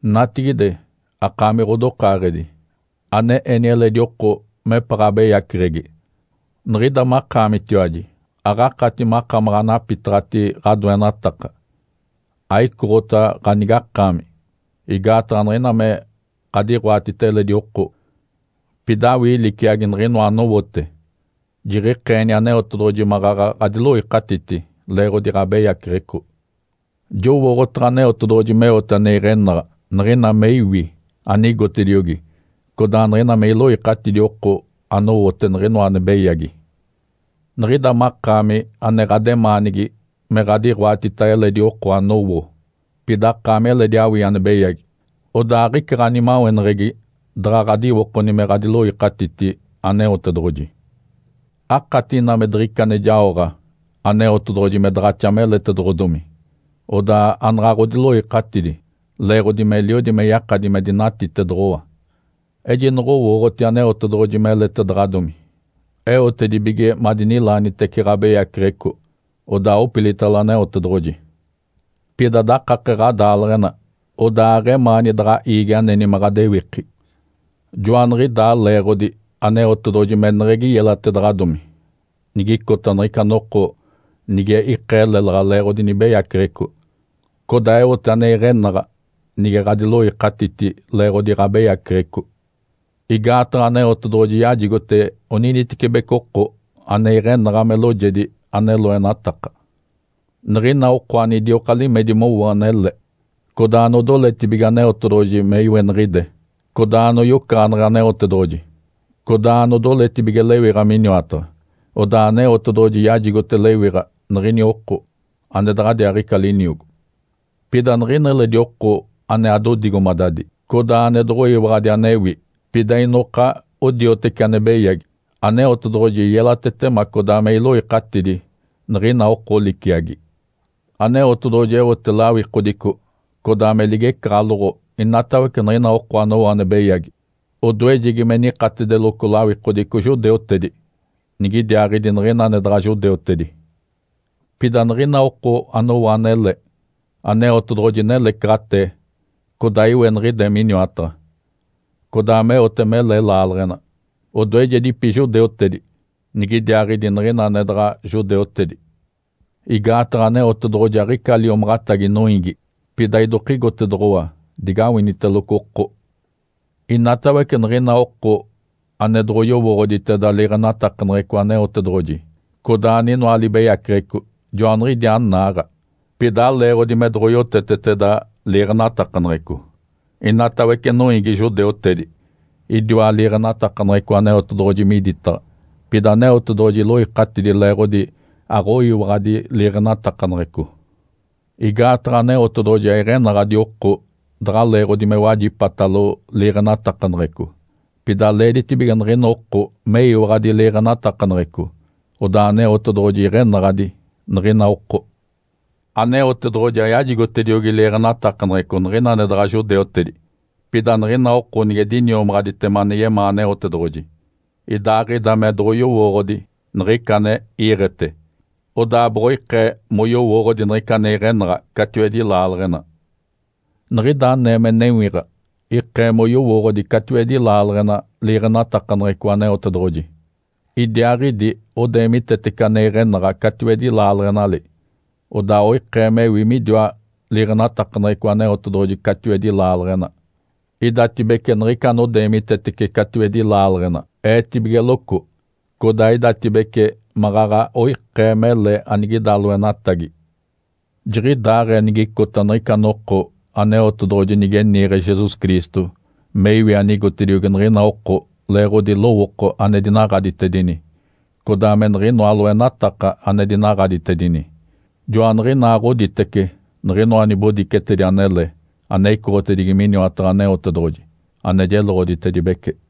Natigide, akaami ɡ̶odokaaɡ̶edi, ane eni eledi oko mepaɡ̶a abeyaceɡ̶egi. Niɡ̶ida makaamitiwaji aɡ̶akati makamaɡ̶a anapitaɡ̶ati ɡ̶adoenataka, aicoɡ̶ota ganigakaami. Igaataɡ̶a niɡ̶ina me ɡ̶adiɡ̶oatita eledi oko, pida awii liciagi niɡ̶inoa anowote, jiɡ̶ikeeni Aneotedoɡ̶oji maɡ̶aɡ̶a ɡ̶adiloikatiti leeɡ̶odi ɡ̶abeyaceɡ̶eco. Jowooɡ̶otaɡ̶a Aneotedoɡ̶oji meote ane iɡ̶enaɡ̶a niɡ̶ina me iwi anigotediogi codaa niɡ̶ina me iloikatidi oko anowote niɡ̶inoa ane beyagi. Niɡ̶ida makaami ane ɡ̶ademaanigi me ɡ̶adiɡ̶oatita eledi oko anowo, pida akaami eledi awii ane beyagi. Odaa aɡ̶ica ɡ̶animaweneɡ̶egi daɡ̶a ɡ̶adiwokoni me ɡ̶adiloikatiti Aneotedoɡ̶oji. Akati ina me diɡ̶ica ane jaoɡ̶a Aneotedoɡ̶oji me daɡ̶axa meletedoɡ̶odomi, odaa anaɡ̶a ɡ̶odiloikatidi leeɡ̶odi meliodi me yakadi me dinatitedoɡ̶owa. Ejinoɡ̶owooɡ̶oti Aneotedoɡ̶oji meletedaɡ̶adomi, eotedibige madinilaanitece ɡ̶abeyaceɡ̶eco, odaa opilitalo Aneotedoɡ̶oji. Pida dakake ɡ̶adaaleɡ̶ena, odaa aɡ̶emaani daɡ̶a iigi aneni me ɡ̶adewiki. Joaniɡ̶idaa leeɡ̶odi Aneotedoɡ̶oji meneɡ̶egi yelatedaɡ̶adomi nigicota niɡ̶ica noko nige ikee lélaɡ̶a leeɡ̶odi nibeyaceɡ̶eco, codaa eote ane iɡ̶enaɡ̶a nige ɡ̶adiloikatiti leeɡ̶odi ɡ̶abeyaceɡ̶eco. Igaataɡ̶a Aneotedoɡ̶oji yajigote oninitecibeci oko ane iɡ̶enaɡ̶a me loojedi ane loenataka. Niɡ̶ina oko anidioka limedi mowo anele, codaa anodoletibige Aneotedoɡ̶oji me iweniɡ̶ide, codaa anoyocaɡ̶aneɡ̶e Aneotedoɡ̶oji, codaa anodoletibige lewiɡ̶a miniwataɡ̶a, odaa Aneotedoɡ̶oji yajigote lewiɡ̶a niɡ̶ini oko ane daɡ̶adiaaɡ̶ica liniogo. Pida niɡ̶ina eledi oko ane adodigomadadi, codaa ane doɡ̶oyiwaɡ̶adi anewi, pida inoka odioteci ane beyagi, Aneotedoɡ̶oji yelatetema codaa me iloikatidi niɡ̶ina oko liciagi. Aneotedoɡ̶oji eote lawikodico codaa me ligecaɡ̶aloɡ̶o inatawece niɡ̶ina oko anowo ane beyagi. Odoejegi me nikatedeloco lawikodico judeutedi, nigidiaaɡ̶idi niɡ̶ina ane daɡ̶a judeutedi. Pida niɡ̶ina oko anowo anele, Aneotedoɡ̶oji nelecaɡ̶atee, codaa iweniɡ̶ide miniwataɡ̶a, codaa meote mele laaleɡ̶ena. Odoejedipi judeutedi, nigidiaaɡ̶idi niɡ̶ina ane daɡ̶a judeutedi. Igaataɡ̶a Aneotedoɡ̶oji aɡ̶ica liomaɡ̶atagi noiigi, pida idokigotedoɡ̶owa digawiniteloco oko. Inatawece niɡ̶ina oko ane doɡ̶oyowooɡ̶oditeda liiɡ̶enatakaneɡ̶eco Aneotedoɡ̶oji, codaa aninoa libeyaceɡ̶eco, joaniɡ̶idiaa naaɡ̶a. (Pida aleeɡ̶odi me doɡ̶oyoteteteda liiɡ̶enatakaneɡ̶eco). Inatawece noiigi judeutedi idiwa liiɡ̶enatakaneɡ̶eco Aneotedoɡ̶oji miditaɡ̶a, pida Aneotedoɡ̶oji iloikatidi leeɡ̶odi aɡ̶oyiwaɡ̶adi liiɡ̶enatakaneɡ̶eco. Igaataɡ̶a Aneotedoɡ̶oji aiɡ̶enaɡ̶adi oko daɡ̶a leeɡ̶odi me wajipatalo liiɡ̶enatakaneɡ̶eco, pida leeditibige niɡ̶ina oko meyiwaɡ̶adi liiɡ̶enatakaneɡ̶eco, odaa Aneotedoɡ̶oji iɡ̶enaɡ̶adi niɡ̶ina oko. Aneotedoɡ̶oji ayajigotediogi liiɡ̶enatakaneɡ̶eco niɡ̶ina ane daɡ̶a judeutedi. Pida niɡ̶ina oko nige diniomaɡ̶aditema ane yemaa Aneotedoɡ̶oji, idaaɡ̶ida me doɡ̶oyowooɡ̶odi niɡ̶ica ane iiɡ̶ete, odaa boɡ̶oikee moyowooɡ̶odi niɡ̶ica ane iɡ̶enaɡ̶a catiwedi laaleɡ̶ena. Niɡ̶ida anee me newiɡ̶a ikee moyowooɡ̶odi catiwedi laaleɡ̶ena liiɡ̶enatakaneɡ̶eco Aneotedoɡ̶oji. Idiaaɡ̶idi odeemitetece ane iɡ̶enaɡ̶a catiwedi laaleɡ̶enali, odaa oikee mewi midiwa liiɡ̶enatakaneɡ̶eco Aneotedoɡ̶oji catiwedi laaleɡ̶ena. Idatibece niɡ̶ica anodeemitetece catiwedi laaleɡ̶ena eetibigeloco, codaa idatibece maɡ̶aɡ̶a oikee mele anigida loenatagi. Jiɡ̶idaaɡ̶ee nigicota niɡ̶ica noko Aneotedoɡ̶oji nige niiɡ̶e Jesus Cristo me iwi anigotediogi niɡ̶ina oko leeɡ̶odi lowooko ane dinaɡ̶aditedini, codaa me niɡ̶inoa loenataka ane dinaɡ̶aditedini. Joaniɡ̶inaaɡ̶oditece niɡ̶inoa nibodicetedi anele ane icoɡ̶otedigi miniwataɡ̶a Aneotedoɡ̶oji, ane jeloɡ̶oditedibece.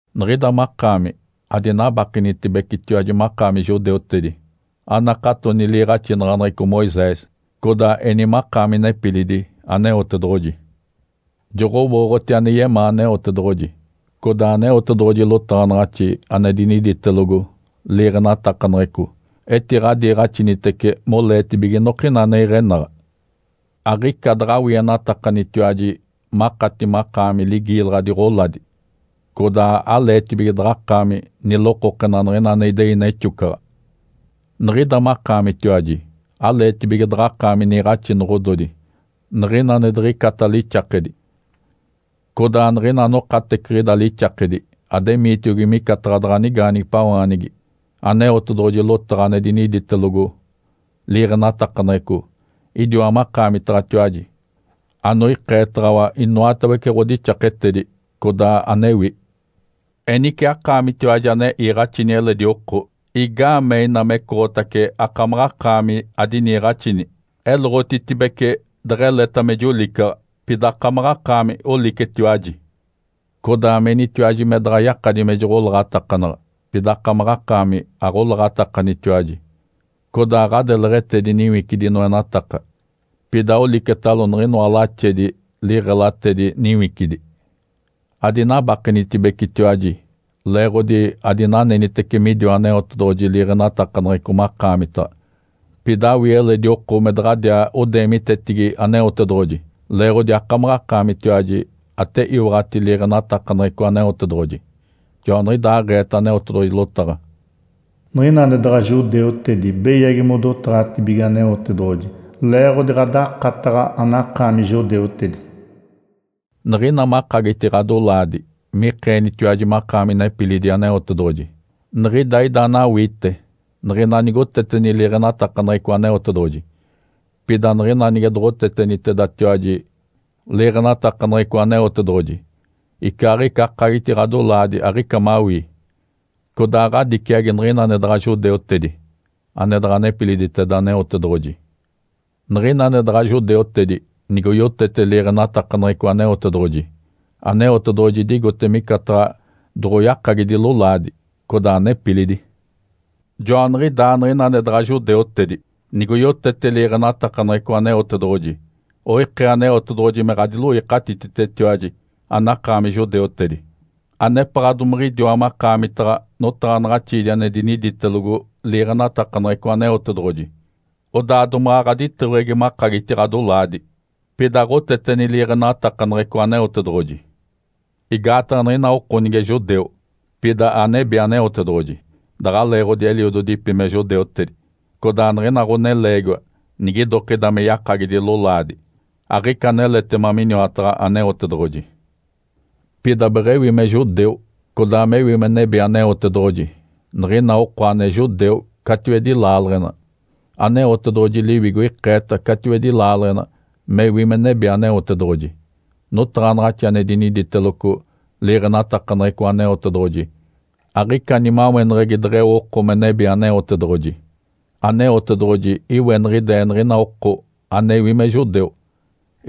Niɡ̶ida makaami adinabakenitibecetiwaji makaami judeutedi. Anakatoni liiɡ̶axinaɡ̶aneɡ̶eco Moisés, codaa eni makaami nepilidi Aneotedoɡ̶oji. Joɡ̶owooɡ̶oti ane yemaa Aneotedoɡ̶oji, codaa Aneotedoɡ̶oji lotaɡ̶anaɡ̶axi ane diniditelogo liiɡ̶enatakaneɡ̶eco etiɡ̶adiiɡ̶axinitece moleetibige inokina ane iɡ̶enaɡ̶a. Aɡ̶ica daɡ̶awienatakanitiwaji makati makaami ligiilaɡ̶adi ɡ̶oladi, codaa aleetibige daɡ̶akaami nilokokena niɡ̶ina ane idei nexocaɡ̶a. Niɡ̶ida makaamitiwaji aleetibige daɡ̶akaami niiɡ̶axinoɡ̶ododi niɡ̶ina ane diɡ̶icata lixakedi, codaa niɡ̶ina anokateciɡ̶ida lixakedi ademiitiogi micataɡ̶a daɡ̶a nigaanigipawaanigi. Aneotedoɡ̶oji lotaɡ̶a ane diniditelogo liiɡ̶enatakaneɡ̶eco idiwa makaamitaɡ̶atiwaji anoikeetaɡ̶awa inoatawece ɡ̶odixaketedi, codaa anewi. Enice akaamitiwaji ane iiɡ̶axini eledi oko, igaamee ina mecoɡ̶otace akamaɡ̶akaami adiniiɡ̶axini? Eloɡ̶otitibece deɡ̶eleta me jolicaɡ̶a, pida akamaɡ̶akaami olicetiwaji. Codaa menitiwaji me daɡ̶a yakadi me joɡ̶olaɡ̶atakanaɡ̶a, pida akamaɡ̶akaami aɡ̶olaɡ̶atakanitiwaji. Codaa ɡ̶adeleɡ̶etedi niwicidi noenataka, pida olicetalo niɡ̶inoa laxedi liɡ̶elatedi niwicidi. Adinabakenitibecetiwaji leeɡ̶odi adinanenitece midiwa Aneotedoɡ̶oji liiɡ̶enatakaneɡ̶eco makaamitaɡ̶a. Pida awii eledi oko me daɡ̶adiaa odeemitetigi Aneotedoɡ̶oji leeɡ̶odi akamaɡ̶akaamitiwaji ate iwaɡ̶ati liiɡ̶enatakaneɡ̶eco Aneotedoɡ̶oji. Joaniɡ̶idaaɡ̶eeta Aneotedoɡ̶oji lotaɡ̶a, “Niɡ̶ina ane daɡ̶a judeutedi beyagi modotaɡ̶atibige Aneotedoɡ̶oji leeɡ̶odi ɡ̶adakataɡ̶a, anakaami judeutedi.” Niɡ̶ina makagiti ɡ̶adolaadi mikeenitiwaji makaami nepilidi Aneotedoɡ̶oji, niɡ̶ida ida anawiite niɡ̶ina nigoteteni liiɡ̶enatakaneɡ̶eco Aneotedoɡ̶oji. Pida niɡ̶ina nige doɡ̶otetenitedatiwaji liiɡ̶enatakaneɡ̶eco Aneotedoɡ̶oji, icaaɡ̶ica akagiti ɡ̶adolaadi, aɡ̶ica mawii, codaa ɡ̶adiciagi niɡ̶ina ane daɡ̶a judeutedi (ane daɡ̶a nepiliditeda Aneotedoɡ̶oji). Niɡ̶ina ane daɡ̶a judeutedi nigoyotete liiɡ̶enatakaneɡ̶eco Aneotedoɡ̶oji, Aneotedoɡ̶oji idigote micataɡ̶a doɡ̶oyakagidi lolaadi, codaa nepilidi. Joaniɡ̶idaa niɡ̶ina ane daɡ̶a judeutedi, nigoyotete liiɡ̶enatakaneɡ̶eco Aneotedoɡ̶oji, oikee Aneotedoɡ̶oji me ɡ̶adiloikatititetiwaji anakaami judeutedi, anepaɡ̶a domiɡ̶idiwa makaamitaɡ̶a notaɡ̶anaɡ̶axiidi ane diniditelogo liiɡ̶enatakaneɡ̶eco Aneotedoɡ̶oji, odaa domaɡ̶a ɡ̶aditeweɡ̶egi makagiti ɡ̶adolaadi, pida aɡ̶oteteni liiɡ̶enatakaneɡ̶eco Aneotedoɡ̶oji. Igaataɡ̶a niɡ̶ina oko nige judeu, pida anebi Aneotedoɡ̶oji daɡ̶a leeɡ̶odi eliododipi me judeutedi. Codaa niɡ̶ina ɡ̶oneleegiwa nigidokida me yakagidi lolaadi, aɡ̶ica aneletema miniwataɡ̶a Aneotedoɡ̶oji. Pida beɡ̶ewi me judeu, codaa mewi me nebi Aneotedoɡ̶oji, niɡ̶ina oko ane judeu catiwedi laaleɡ̶ena. Aneotedoɡ̶oji Liwigo ikeeta catiwedi laaleɡ̶ena mewi me nebi Aneotedoɡ̶oji. Notaɡ̶anaɡ̶axi ane diniditeloco liiɡ̶enatakaneɡ̶eco Aneotedoɡ̶oji aɡ̶ica nimaweneɡ̶egi deɡ̶eo oko me nebi Aneotedoɡ̶oji. Aneotedoɡ̶oji iweniɡ̶ide niɡ̶ina oko anewi me judeu,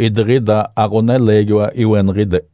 idiɡ̶ida aɡ̶oneleegiwa iweniɡ̶ide.